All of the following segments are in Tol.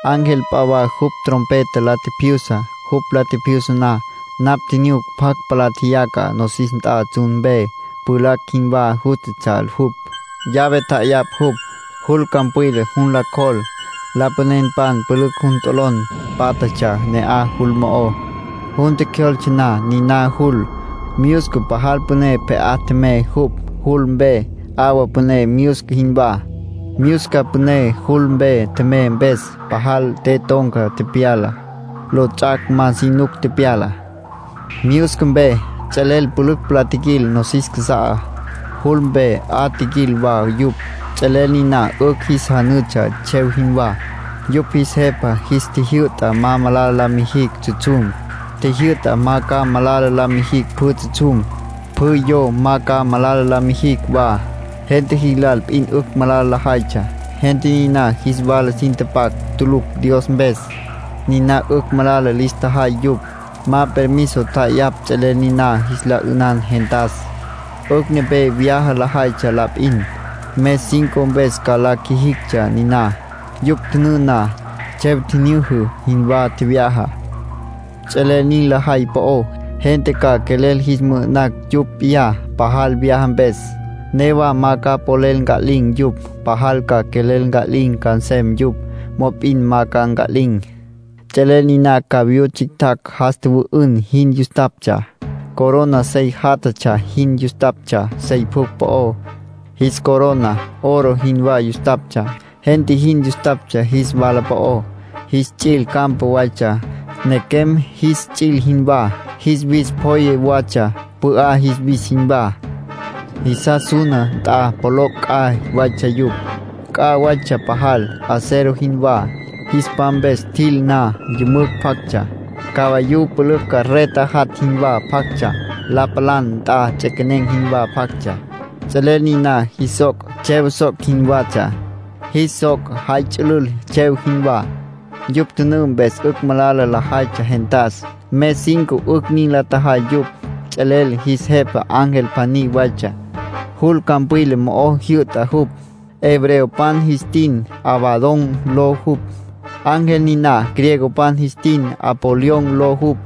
Ángel p'a wa jupj trompeta la tjipjyusa. Jupj la tjipjyusa na, napj tjinyuc pjacj palá tjeyaca nosis nt'a tsjun mpe. Pjulacj jinwá jústatsja jupj. Llave tja'ayapj jupj, jul campwila jun la cjol. Lapanenpan pülücj jun t'olon pátjatsja ne'aj, jul mo'ó. Jun tjecjyoltse na niná jul, myusca pajal püné pje'á tjemey jupj, jul mpe, 'awa püné myusca jinwá. Myusca püné jul mpe tjemey mpes, pajal te ton̈ca tepyala, lots'ac' ma si nuc tepyala. Myusca mpe ts'elel pülücj palá tjiquil nosis casa'á. Jul mpe 'a tjiquil wa yupj. Ts'elel niná 'ücj jis janütsja tsjev jinwá. Yupj jis jepa jis tjijyü'ta ma malala la mijicj tsjutsjum. Tjijyü'ta ma ca malala la mijicj pjü tsjutsjum. Pjü yo ma ca malala la mijicj wa. Gente jis lal p'in 'ücj malala lajaytsja. Gente niná jis wala sin tapac tulucj Dios mpes, niná 'ücj malala lis tjajay yupj. Ma permiso tja'ayapj ts'elel niná jis la 'ünan gentas. 'Ücj nepé vyaja lajaytsja la p'in. Mes cinco mpes ca la qjuijictsja niná. Yupj tjünǘ na, tsjev tjinyüjü jinwá tjevyaja. Ts'elel nin lajay po'ó, gente ca quelel jis mü'ü'nacj yupj p'iyá, pajal vyaja mpes, newa ma ca polel nca'lin̈ yupj. Pajal ca quelel nca'lin̈ ca nsem yupj, mop'in ma ca nca'lin̈. Ts'elel niná cavayú tsjictjacj jas tjüwü'ün jin yustaptsja. Corona sey játjatsja jin yustaptsja sey pjucj po'ó. Jis corona oro jinwá yustaptsja. Gente jin yustaptsja jis wala po'ó. Jis ts'il campa waytsja, nequem jis ts'il jinwá. Jis wis pjoye watsja, pü'á jis wis jinwá. Jisas suna nt'a pjoloc' c'a waytsja yupj. C'a waytsja pajal, acero jinwá. Jis pam mpes tjil na, yümücj pjactsja, cavayú pülücj carreta jat' jinwá pjactsja, la palan nt'a ts'equenen̈ jinwá pjactsja. Ts'elel niná jis soc', tsjev soc' jinwatsja. Jis soc' jay ts'ülül tsjev jinwá. Yupj tjünǘ mpes 'ücj malala lajaytsja gentas. Mes cinco 'ücj nin la tjajay yupj. Ts'elel jis jepa ángel pjaní waytsja, jul campwila mo'o jyü'ta jupj. Hebreopan jis tin Abadón ló jupj, ángel niná. Griegopan jis tin Apolión ló jupj.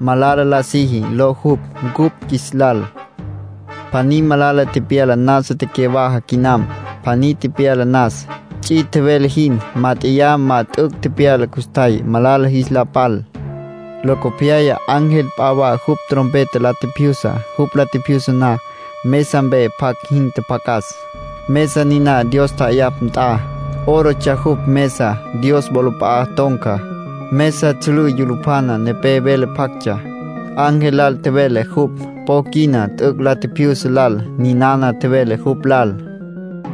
(“Malala La Siji” ló jupj cupj qjuis lal.) Pjaní malala tepyala nasa tecyawaja quinam. Pjaní tepyala nas, ts'i tjevele jin. Mát'eya ma t'üc' tepyala custjay, malala jis la pal. Locopyaya ángel p'a wa jupj trompeta la tjipjyusa. Jupj la tjipjyusa na, mesa mpe pjac jin tjapjacas, mesa niná Dios ja'ayapj nt'a. (Órotsja jupj mesá, Dios wolap'a'a ton̈ca.) Mesa tsjülǘ yulupjana nepé vele pjactsja. Ángel lal tjevele jupj, po quina t'üc' la tjipjyusa lal. Ninana tjevele jupj lal: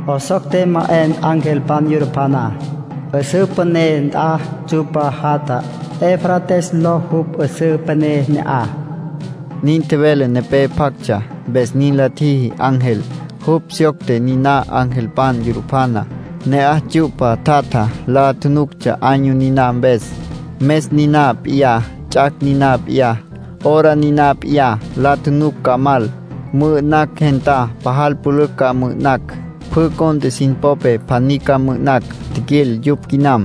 “'Esocte ma 'en angelpan yulupjaná, 'üsǘ püné nt'a tsyu'pa jatja. Eufrates ló jupj, 'üsǘ püné ne'aj”, nin tjevele nepé pjactsja. Mpes nin la tjiji ángel. Jupj syocte niná angelpan yulupjaná. Ne'aj tsyu'pa tjatja, la tjunuctsja año niná mpes, mes niná p'iyá, ts'ac' niná p'iyá, hora niná p'iyá. La tjunuc ca mal, mü'ü'nacj gentá. Pajal pülücj ca mü'ü'nacj. Pjü cont'e sin popé, pjaní ca mü'ü'nacj. Tjiquil yupj quinam.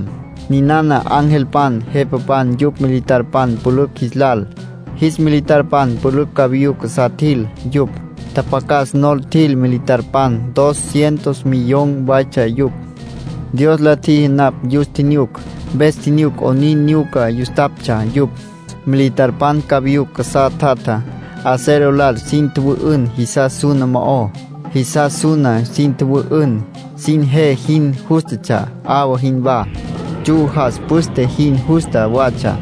Ninana angelpan, jepapan yupj militarpan pülücj jis lal. Jis militarpan pülücj cavayú casá tjil yupj. Tjapjacas nol tjil militarpan. Dos cientos millón waytsja yupj. Dios la tjiji napj yus tjinyuc, mpes tjinyuc 'onin nyuca yustaptsja yupj. Militarpan cavayú casá tjatjá, acero lal sin tjüwü'ün jisas suna mo'ó. Jisas suna sin tjüwü'ün, sin je jin jústatsja, 'awa jinwá, tsju jas püste jin justa watsja,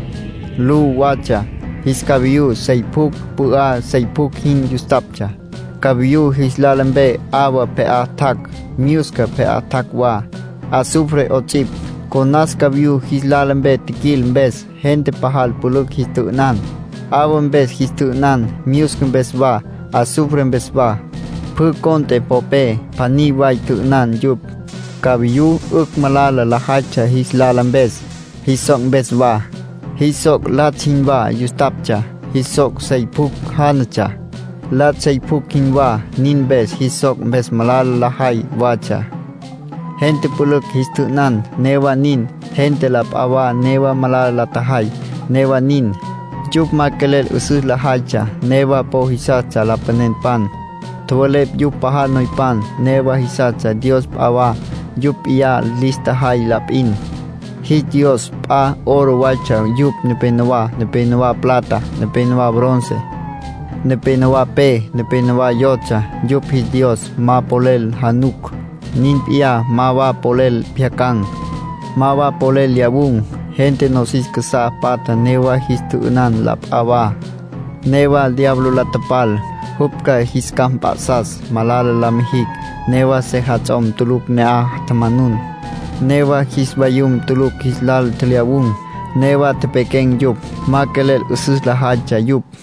lu watsja. Jis cavayú sey pjucj pü'á sey pjucj jin yustaptsja. Cavayú jis lala mpe 'awa pje'á tjac', myusca pje'á tjac' wa, azufre 'ots'ipj. Conas cavayú jis lala mpe tjiquil mpes, gente pajal pülücj jis tjü'ünan. 'Awa mpes jis tjü'ünan, myusca mpes wa, azufre mpes wa. Pjü cont'e popé, pjaní way tjü'ünan yupj. Cavayú 'ücj malala lajaytsja jis lala mpes, jis soc' mpes wa. Jis soc' latsj jinwá yustaptsja. Jis soc' sey pjucj jánatsja, latsj sey pjucj jinwá. Nin mpes jis soc' mpes malala lajay watsja. Gente pülücj jis tjü'ünan. Newa nin, gente la p'a wa newa malala la tjajay. Newa nin, yupj ma quelel 'üsüs lajaytsja. Newa po jisastsja lapanenpan, tjowelepj yupj pajal noypan. Newa jisastsja dios p'a wa, yupj p'iyá lis tjajay la p'in. Jis dios p'a, oro waytsja yupj nepenowá, nepénowa plata, nepénowa bronce, nepénowa pe, nepénowa yotsja. Yupj jis dios ma polel januc, nin p'iyá ma wa polel pjyacan̈, ma wa polel lyawun̈. Gente nosis casá patja newa jis tjü'ünan la p'a wa, newa diablo la tapal, jupj ca jis capj mp'a'sas malala la mijicj. Newa sejats'om tulucj ne'aj tjamanun, newa jis vayum tulucj jis lal tjelyawun̈. Newa tepequen̈ yupj. Ma quelel 'üsüs lajaytsja yupj.